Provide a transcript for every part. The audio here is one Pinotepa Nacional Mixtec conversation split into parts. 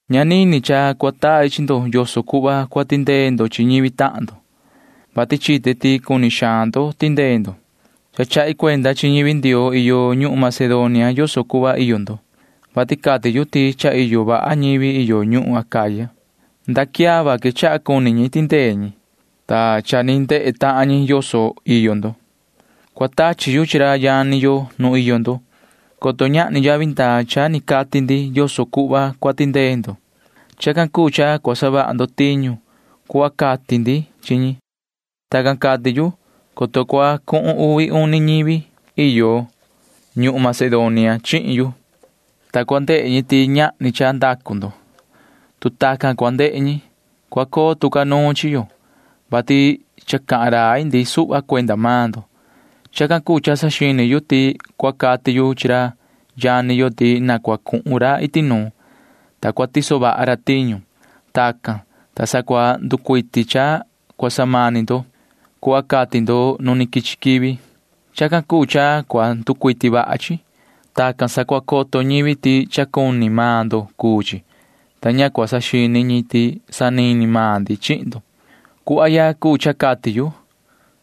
Ña nini cha cua tai chi ndo yoso cuhva cua tindee ndo chi ñivi tahan ndo, vati chite ti cuni xaan ndo tindee ndo. Cha chahi cuenda chi ñivi Ndioo iyo ñuhun Macedonia yoso cuhva iyo ndo, vati cati yu ti cha iyo vaha ñivi iyo ñuhun Acaya. Nda quiava quechaha cuni ñi tindee ñi, ta cha ni ndehe tahan ñi yoso iyo ndo. Cua tachi yu chi ra yani yo nu iyo ndo, coto ñahni yavi ndaa cha ni cati ndi yoso cuhva cua tindee ndo. Chacan cuu cha cua savaha ndo tiñu cuhva cati ndi chi ñi. Tacan cati yu, coto cua cuhun uvi uni ñivi iyo ñuhun Macedonia chihin yu, ta cua ndehe ñi ti ñahni cha ndacu ndo. Tu tacan cua ndehe ñi, cua coo tu ca nuun chi yo, vati cha cahan rai ndi suhva cuenda maan ndo. Chacan cuu cha saxini yu ti cua cati yu chi ra yani yo ti na cua cuhun ra iti nuun, ta cua tiso vaha ra tiñu. Tacan, ta sa cua nducuiti cha cua samani ndo cuhva cati ndo nu quichi quivi. Chacan cuu cha cua nducuiti vaha chi. Tacan sa cua coto ñivi ti cha cuni maan ndo cuu chi, ta ña cua saxini ñi ti sanini maan ndi chihin ndo. Cuhva ya cuu cha cati yu.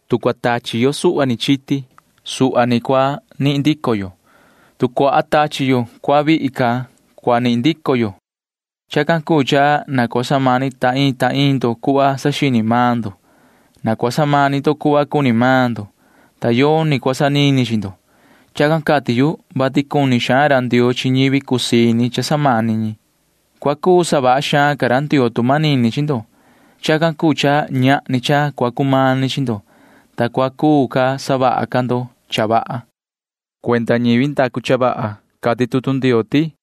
Tu cua tachi yo suhva ni chiti, suhva ni cua nihin ndico yo. Tu cua tachi yo cuaha vihi ca, cuaha cua nihin ndico yo. Chacan cuu cha na cua samani ta iin ta iin ndo cuhva saxini maan ndo. Na cua samani ndo cuhva cuni maan ndo, ta yoni cua sanini chi ndo. Chacan cati yu, vati cuni xaan ra Ndioo chi ñivi cusii ini cha samani ñi. Cua cuu savaha xaan ca ra Ndioo tu manini chi ndo. Chacan cuu cha ñahni cha cua cumani chi ndo, ta cua cuu ca savaha ca ndo cha vaha. Cuenda ñivi ndacu cha vaha cati tutu Ndioo ti: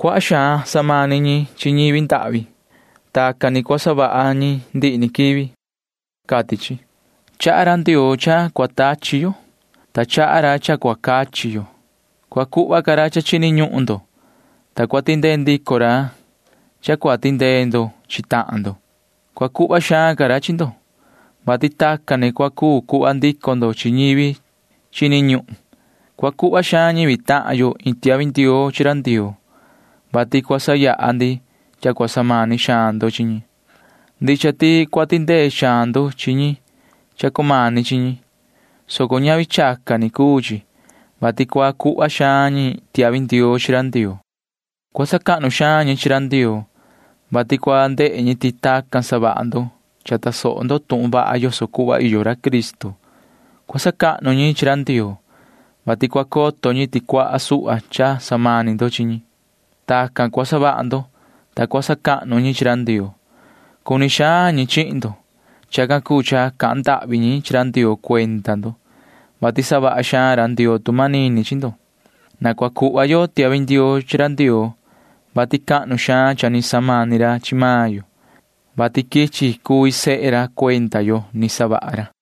Cuaha xaan samani ñi chi ñivi ndahvi. Tacan ni cua savaha ñi ndihi ni quivi, cati chi. Chaha ra Ndioo cha cua tachi yo, ta chaha ra cha cua cachi yo. Cua cuhva ca ra cha chini ñuhun ndo, ta cua tindee ndico ra cha cua tindee ndo chi tahan ndo. Cua cuhva xaan ca ra chi ndo, vati tacan ni cua cuu cuhva ndico ndo chi ñivi chini ñuhun. Cua cuhva xaan ñivi tahan yo iin tiahvi ndioo chi ra Ndioo, vati cua sayaha ndi cha cua samani xaan ndo chi ñi. Ndicha ti cua tindee xaan ndo chi ñi cha cumani chi ñi, soco ñavi chacan ni cuu chi, vati cua cuhva xaan ñi tiahvi ndioo chi ra Ndioo. Cua sacahnu xaan ñi chi ra Ndioo, vati cua ndehe ñi ti tacan savaha ndo cha tasoho ndo tuhun vaha yoso cuhva iyo ra Cristo. Cua sacahnu ñi chi ra Ndioo, vati cua coto ñi ti cuaha suhva cha samani ndo chi ñi. Tacan cua savaha ndo, ta cua sacahnu ñi chi ra Ndioo. Cuni xaan ñi chihin ndo. Chacan cuu cha cahan ndahvi ñi chi ra Ndioo cuenda ndo, vati savaha xaan ra Ndioo tu manini chi ndo. Na cua cuhva yo tiahvi ndioo chi ra Ndioo, vati cahnu xaan cha ni samani ra chi maan yo, vati quichi cuvi sehe ra cuenda yo ni savaha ra.